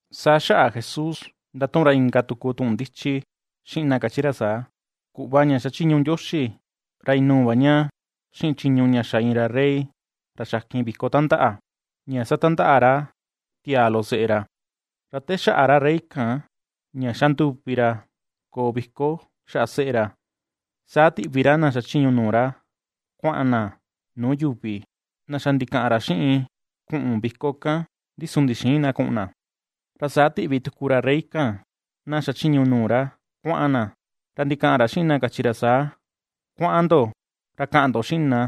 Saa xaꞌa Jesús ndatuꞌun ra inka tuku tuꞌun ndichi xiꞌin na kachi ra saa: ―Kuꞌva ña xachiñu Ndioxi, ra inuu va ña xiꞌin chiñu ña xa iin rey ra xakin viko tandaꞌa, ña satandaꞌa ra tiaa loꞌo seꞌe ra. Ra te xaꞌa ra rey kan ña ^xa nduvi ra koo viko xaꞌa seꞌe ra, saa tiꞌvi ra na xachiñu nuu ra kuaꞌan na nuu yuvi, na xa ndikaꞌan ra xiꞌin kuꞌun viko kan, ndi su ndixïin na kuꞌun na. Ra saa tiꞌvi tuku va ra rey kan na xachiñu nuu ra kuaꞌan na, ra ndikaꞌan ra xiꞌin na kachi ra saa: “Kuaꞌan ndo ra kaꞌan ndo xiꞌin na,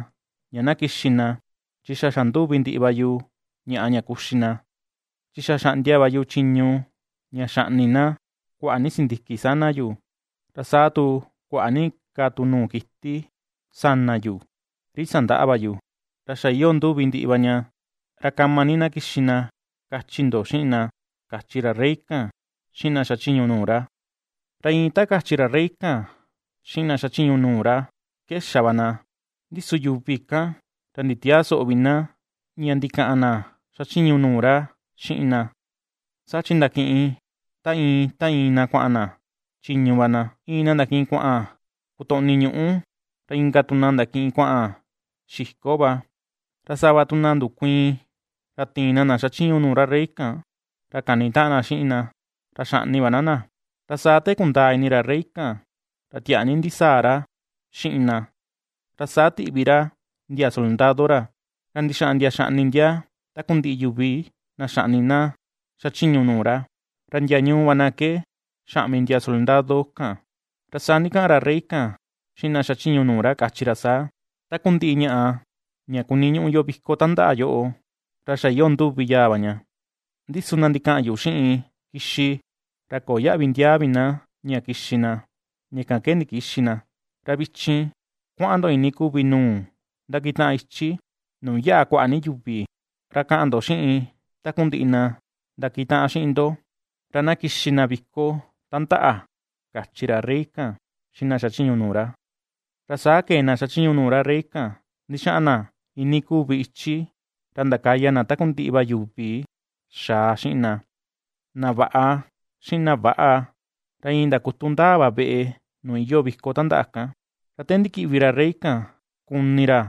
ña na kixi na chi xa xanduvi ndiꞌi va yu ñaꞌa ña kuxi na. Chi xa xaꞌndia va yu chiñu ña xaꞌni na, kuaꞌa ni sindiki sana yu, ra saa tu kuaꞌa ni ka tu nuu kiti sana yu ri sandaꞌa va yu, ra xa iyoo nduvi ndiꞌi va ña, ra kama ni na kixi na kachi ndo xiꞌin na”, kachi ra rey kan xiꞌin na xachiñu nuu ra. Ra iin ta kachi ra rey kan xiꞌin na xachiñu nuu ra ke xa va na: Ndi su yuvi kan ra nditiäa soꞌo vi na ña ndikaꞌan na xachiñu nuu ra xiꞌin na, saa chi ndakiꞌin ta iin ta iin na kuaꞌan na chiñu va na, iin na ndakiꞌin kuaꞌan kotoꞌni ñuꞌu, ra inka tu na ndakiꞌin kuaꞌan xiko va, ra sava tu na ndukuiin, ra tiin ná na xachiñu nuu ra rey kan ra kanitaꞌan na xiꞌin na, ra xaꞌni va ná na. Ra saa te kundaa ini ra rey kan, ra tiaa ni ndisaa ra xiꞌin na, ra saa tiꞌvi ra ndia soldado ra, ra ndixaꞌan ndia xaꞌni ndia takundiꞌi yuvi na xaꞌni na na xachiñu nuu ra, ra ndia ñuu va na ke xaꞌmi ndia soldado kan. Ra saa ndikaꞌan ra rey kan xiꞌin na xachiñu nuu ra kachi ra saa: “Takundiꞌi ñaꞌa ña kuniñuꞌu yo viko tandaꞌa yoꞌo, ra xa iyoo nduvi yaa va ña. Ndi su na ndikaꞌan yu xiꞌin kixi, ra köo yaꞌvi ndiaa vi na ña kixi na, ña kan ke ndikïxi na. Ra vichin kuaꞌan ndo iinii kuvi nuu ndakitaꞌan ichi, nuu yaꞌa kuaꞌa ni yuvi, ra kaꞌan ndo xiꞌin takundiꞌi na ndakitaꞌan xiꞌin ndo, ra na kixi na viko tandaꞌa”, kachi ra rey kan xiꞌin na xachiñu nuu ra. Ra saa kee na xachiñu nuu ra rey kan ndixaꞌan na iinii kuvi ichi, ra ndakaya na takundiꞌi va yuvi xaa xiꞌin na, na vaꞌa, xiꞌin na väꞌa, ra iin ndakutu ndaa va veꞌe nuu iyoo viko tandaꞌa kan. Ra te ndikiꞌvi ra rey kan kuni ra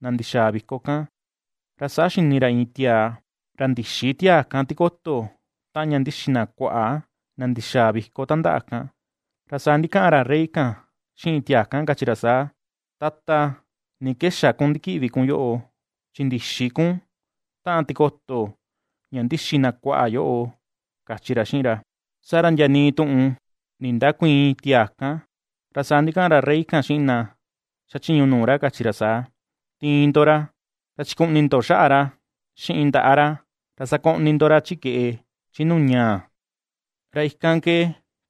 na ndixaa viko kan, ra saa xini ra iin tiaa, ra ndïxi tiaa kan tikoto taꞌan ña ndixi na kuaꞌa, na ndixaa viko tandaꞌa kan. Ra saa ndikaꞌan ra rey kan xiꞌin tiaa kan kachi ra saa: “Tata, ¿ni ke xa kun ndikiꞌvi kun yoꞌo? Chi ndïxi kun taꞌan tikoto ña ndixi na kuaꞌa yoꞌo”, kachi ra xiꞌin ra. Saa ra ndia nii tuꞌun ndindäkuiin tiaa kan. Ra saa ndikaꞌan ra rey kan xiꞌin na xachiñu nuu ra kachi ra saa: “Tiin ndo ra, ra chikuꞌni ndo xaꞌa ra xiꞌin ndaꞌa ra, ra sakoꞌni ndo ra chi keꞌe, chi nuu ñaa, ra ikan ke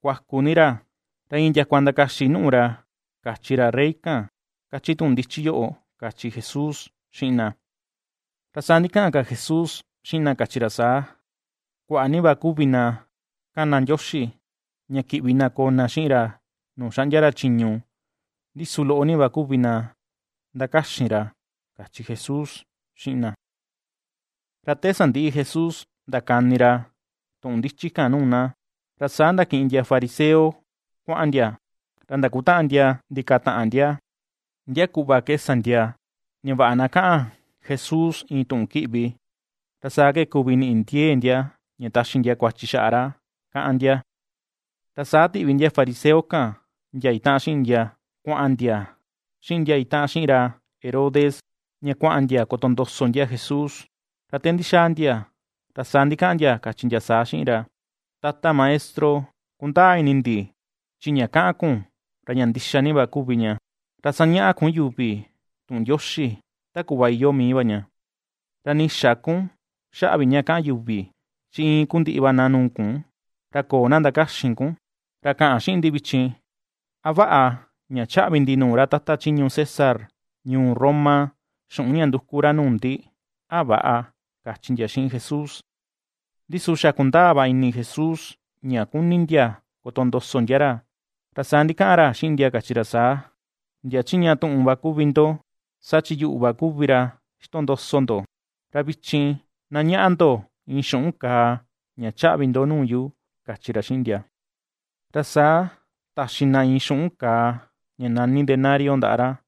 kuaku ni ra, ra iin ndiakua ndakaxi nùꞌù ra”, kachi ra rey kan, kachi tuꞌun ndichi yoꞌo ―kachi Jesús xiꞌin na. Ra saa ndikaꞌan ka Jesús xiꞌin na kachi ra saa: ―Kuaꞌa ni va kuvi na ^kana Ndioxi, ña kiꞌvi na koo na xiꞌin ra nuu xaꞌndia ra chiñu, ndi su loꞌo ni va kuvi na ^ndakaxin ra ―kachi Jesús xiꞌin na. Ra te sandiꞌi Jesús ndakani ra tuꞌun ndichi kan nuu na, ra saa ndakiꞌin ndia fariseo kuaꞌan ndia, ra ndakutaꞌan ndia ndikataꞌan ndia, ndia kuꞌva ke sa ndia ña vaꞌa na kaꞌan Jesús iin tuꞌun kiꞌvi, ra saa ke kuvi niꞌi ndiee ndia, ña taxi ndia kuachi xaꞌa ra kaꞌan ndia. Ra saa tiꞌvi ndia fariseo kan ndia itaꞌan xiꞌin ndia kuaꞌan ndia xiꞌin ndia itaꞌan xiꞌin ra Herodes, ña kuaꞌan ndia kotondoso ndia Jesús, ra te ndixaa ndia ra saa ndikaꞌan ndia kachi ndia saa xiꞌin ra: ―Tata Maestro, kundaa ini ndi chi ña kaꞌan kun ra ña ndixa ni va kuvi ña, ra sañaꞌa kun yuvi tuꞌun Ndioxi ta kuꞌva iyoo mii va ña, ra nii xä kun xaꞌa vi ña kaꞌan yuvi, chi iin kuu ndiꞌi va na nuu kun, ra köo na ndakaxin kun. Ra kaꞌan xiꞌin ndi vichin, ¿a vaꞌa ña chaꞌvi ndi nuu ra tata chiñu César ñuu Roma, xuꞌun ña nduku ra nuu ndi, a väꞌa? ―kachi ndia xiꞌin Jesús. Ndi su xa ^kundaa va ini Jesús, ña kuni ndia kotondoso ndia ra, ra saa ndikaꞌan ra xiꞌin ndia kachi ra saa: ―Ndia chiꞌña tuꞌun va kuvi ndo, saa chi yuꞌu va kuvi ra ixtondoso ndo. Ra vichin na ñaꞌa ndo iin xuꞌun kàà ña chaꞌvi ndo nuu yu ―kachi ra xiꞌin ndia. Ra saa taxi na iin xuꞌun kàà ña nani denario ndaꞌa ra.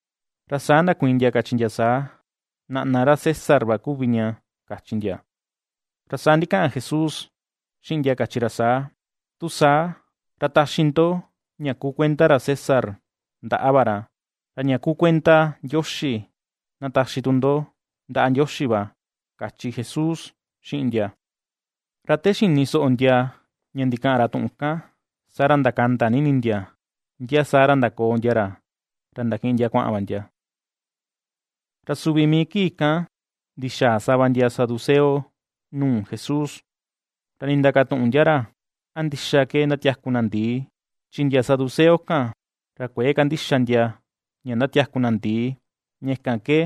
Ra saa ndakuiin ndia kachi ndia saa: ―Naꞌna ra César va kuvi ña ―kachi ndia. Ra saa ndikaꞌan Jesús xiꞌin ndia kachi ra saa: ―Tu saa, ra taxi ndo ña kuu kuenda ra César ndaꞌa va ra, ra ña kuu kuenda Ndioxi na taxi tu ndo ndaꞌa Ndioxi va ―kachi Jesús xiꞌin ndia. Ra te xini soꞌo ndia ña ndikaꞌan ra tuꞌun kan, saa ra ndakanda ni ini ndia, ndia saa ra ndakoo ndia ra, ra ndakiꞌin ndia kuaꞌan va ndia. Ra suvi mii kii kan ndixaa sava ndia saduceo nuu Jesús, ra nindakatuꞌun ndia ra, a ndixa ke ndatiaku na ndi̱ì, chi ndia saduceo kan, ra kuëe kandixa ndia ña ndatiaku na ndi̱ì, ña kan ke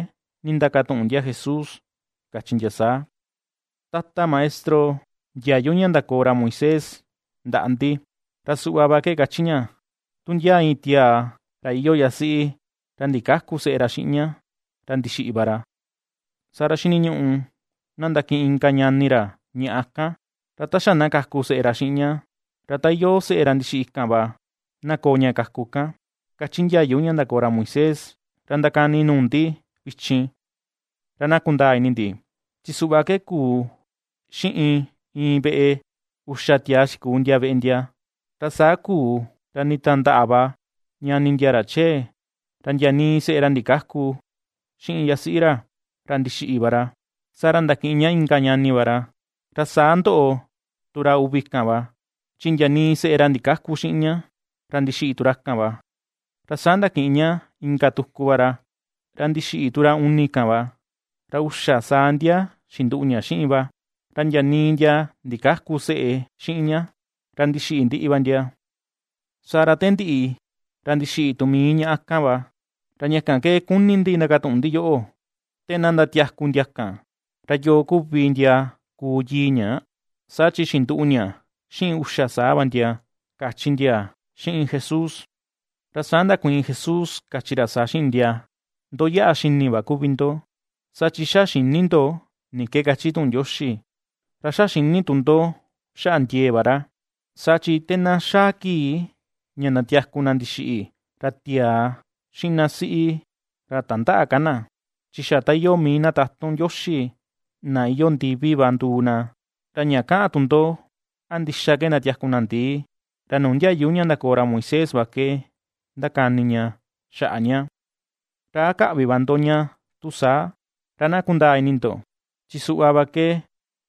nindakatuꞌun ndia Jesús kachi ndia saa: ―Tata Maestro, ndiayu ña ndakoo ra Moisés ndaꞌa ndi, ra suꞌva va ke kachi ña: “Tu ndia iin tiaa ra iyoo yasiꞌi, ra ndikäku seꞌe ra xiꞌin ña, ra ndixiꞌi va ra, saa ra xiniñuꞌu na ndakiꞌin inka ñani ra ñaꞌa kan, ra ta xa na kaku seꞌe ra xiꞌin ña, ra ta iyoo seꞌe ra ndixiꞌi kan va, na koo ña kaku kan”, kachi ndiayu ña ndakoo ra Moisés. Ra ndakani nuu ndi vichin ra na kundaa ini ndi, chi suꞌva ke kuu xiꞌin iin veꞌe: Uxa tiaa xikuu ndia veꞌe ndia. Ra saa kuu ra nditandaꞌa va ñani ndia ra chee, ra ndia nii seꞌe ra ndikäku xiꞌin yasiꞌi ra, ra ndixiꞌi va ra; saa ra ndakiꞌin ña inka ñani va ra. Ra saa ndoꞌo tu ra uvi kan va, chi ndia nii seꞌe ra ndikäku xiꞌin ña, ra ndixiꞌi tu ra kan va, ra saa ndakiꞌin ña inka tuku va ra, ra ndixiꞌi tu ra uni kan va, ra uxa saa ndia xinduꞌu ña xiꞌin va, ra ndia nii ndia ndikäku seꞌe xiꞌin ña, ra ndixiꞌi ndiꞌi va ndia. Saa ra te ndiꞌi, ra ndixiꞌi tu mii ñaꞌa kan va. Ra ña kan ke kuni ndi ndakatuꞌun ndi yoꞌo: Te na ndatiaku ndia kan, ¿ra yoo kuvi ndia kuu yii ña?, saa chi xinduꞌu ña xiꞌin uxa saa va ndia ―kachi ndia xiꞌin Jesús. Ra saa ndakuiin Jesús kachi ra saa xiꞌin ndia: ―Ndo yaꞌa xini va kuvi ndo, saa chi xa xïni ndo ni ke kachi tuꞌun Ndioxi, ra xa xïni tu ndo xaꞌa ndiee va ra. Saa chi te na xaa kii ña ndatiaku na ndixiꞌi, ra tiaa xiꞌin na siꞌi ra tandäꞌa ka na, chi xa ta iyoo mii na tatun Ndioxi, na iyoo ndivi va nduu na. Ra ña kaꞌan tu ndo a ndixa ke ndatiaku na ndi̱ì, ra nuu ndiayu ña ndakoo ra Moisés va ke ndakani ña xaꞌa ña, ¿ra a käꞌvi va ndo ña tu saa? Ra na kundaa ini ndo chi suꞌva va ke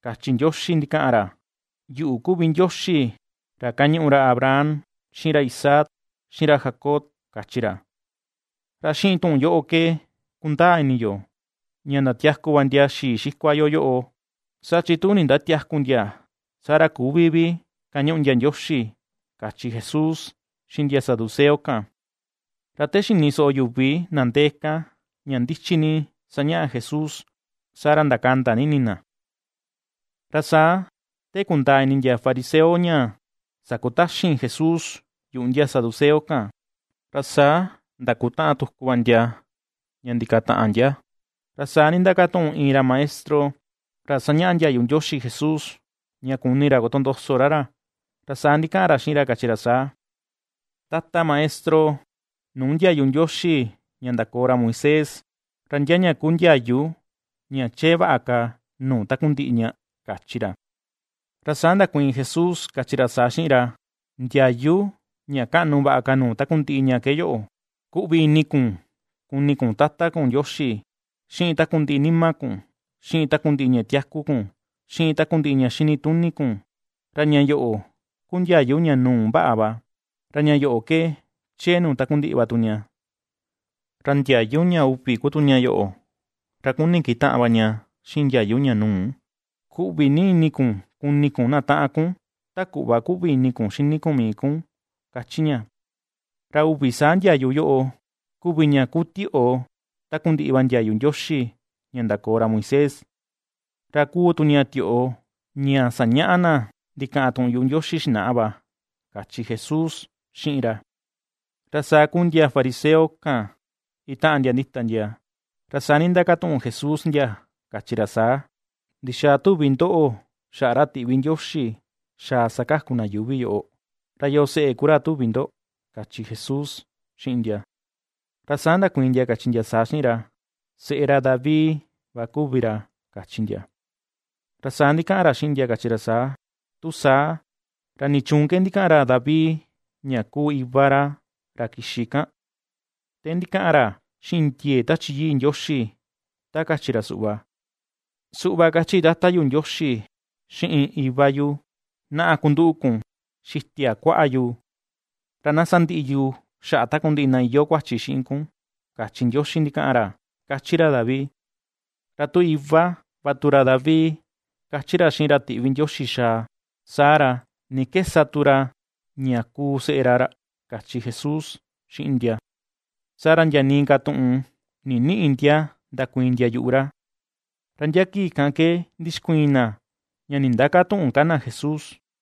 kachi Ndioxi ndikaꞌan ra: “Yuꞌu kuvi Ndioxi ra ^kañuꞌu ra Abraham, xiꞌin ra Isaac, xiꞌin ra Jacob”, kachi ra. Ra xiꞌin tuꞌun yoꞌo ke kundaa ini yo ña ndatiaku va ndia xii xikua yo yoꞌo, saa chi tu ndindatiäku ndia saa ra küvi vi ^kañuꞌu ndia Ndioxi ―kachi Jesús xiꞌin ndia saduceo kan. Ra te xini soꞌo yuvi na ndee kan, ña ndichi ni ^sañaꞌa Jesús, saa ra ndakanda ni ini na. Ra saa te kundaa ini ndia fariseo ña sakutaxin Jesús yuꞌu ndia saduceo kan, ra saa ndakutaꞌan tuku va ndia ña ndikataꞌan ndia, Ra saa nindakatuꞌun iin ra maestro ra sañaꞌa ndiayu Ndioxi Jesús, ña kuni ra kotondoso ra ra, ra saa ndikaꞌan ra xiꞌin ra kachi ra saa: ―Tata Maestro, ¿nuu ndiayu Ndioxi ña ndakoo ra Moisés, ra ndia ña kuu ndiayu ña chee vaꞌa ka nuu takundiꞌi ña? ―kachi ra. Ra saa ndakuiin Jesús kachi ra saa xiꞌin ra: ―Ndiayu ña kaꞌnu vaꞌa ka nuu takundiꞌi ña ke yoꞌo: “Kuꞌvi ni ini kun kuni kun Tata kun Ndioxi xiꞌin takundiꞌi nima kun, xiꞌin takundiꞌi ña tiaku kun, xiꞌin takundiꞌi ña xinituni kun.” Ra ña yoꞌo ku ndiayu ña nuu vaꞌa va, ra ña yoꞌo ke chee nuu takundiꞌi va tu ña. Ra ndiayu ña uvi ku tu ña yoꞌo, ra kuni kitaꞌan va ña xiꞌin ndiayu ña nuu: “Kuꞌvi ni ini kun kuni kun na taꞌan kun, ta kuꞌva kuꞌvi ini kun xini kun mii kun”, kachi ña. Ra uvi saa ndiayu yoꞌo kuvi ña kuu tioꞌo takundiꞌi va ndiayu Ndioxi ña ndakoo ra Moisés, ra kuu tu ña tioꞌo ña sañaꞌa na ndikaꞌan tuꞌun yuꞌu Ndioxi xinaꞌa va ―kachi Jesús xiꞌin ra. Ra saa kúú ndia fariseo kan itaꞌan ndia ndita ndia, ra saa nindakatuꞌun Jesús ndia, kachi ra saa: ―¿Ndixaa tuvi ndoꞌo xaꞌa ra tiꞌvi Ndioxi xaa sakaku na yuuvi yoꞌo? ¿Ra yoo seꞌe ku ra tuvi ndo? ―kachi Jesús xiꞌin ndia. Ra saa ndakuiin ndia kachi ndia saa xiꞌin ra: ―Seꞌe ra David va kuvi ra ―kachi ndia. Ra saa ndikaꞌan ra xiꞌin ndia kachi ra saa: ―Tu saa, ¿ra nichuun ke ndikaꞌan David ña kuu Iva ra, ra kixi kan? Te ndikaꞌan ra xiꞌin ndiee Tachi Yii Ndioxi, ta kachi ra suꞌva: Suꞌva kachi Tata yu Ndioxi xiꞌin Iva yu: Naꞌa, kunduꞌu kun xitia kuaꞌa yu, ra na sandiꞌi yu xaꞌa takundiꞌi na iyoo kuachi xiꞌin kun, kachi Ndioxi ndikaꞌan ra, kachi ra David. ’Ra tu “Iva” va tu ra David kachi ra xiꞌin ra tiꞌvi Ndioxi xaa, saa ra, ¿ni ke sa tu ra ña kuu seꞌe ra ra? ―kachi Jesús xiꞌin ndia. Saa ra ndia nii ka tuꞌun ninïꞌi ndia ndakuiin ndia yuꞌu ra. Ra ndia kii kan ke ndixkuiin na ña nindäkatuꞌun ka na Jesús.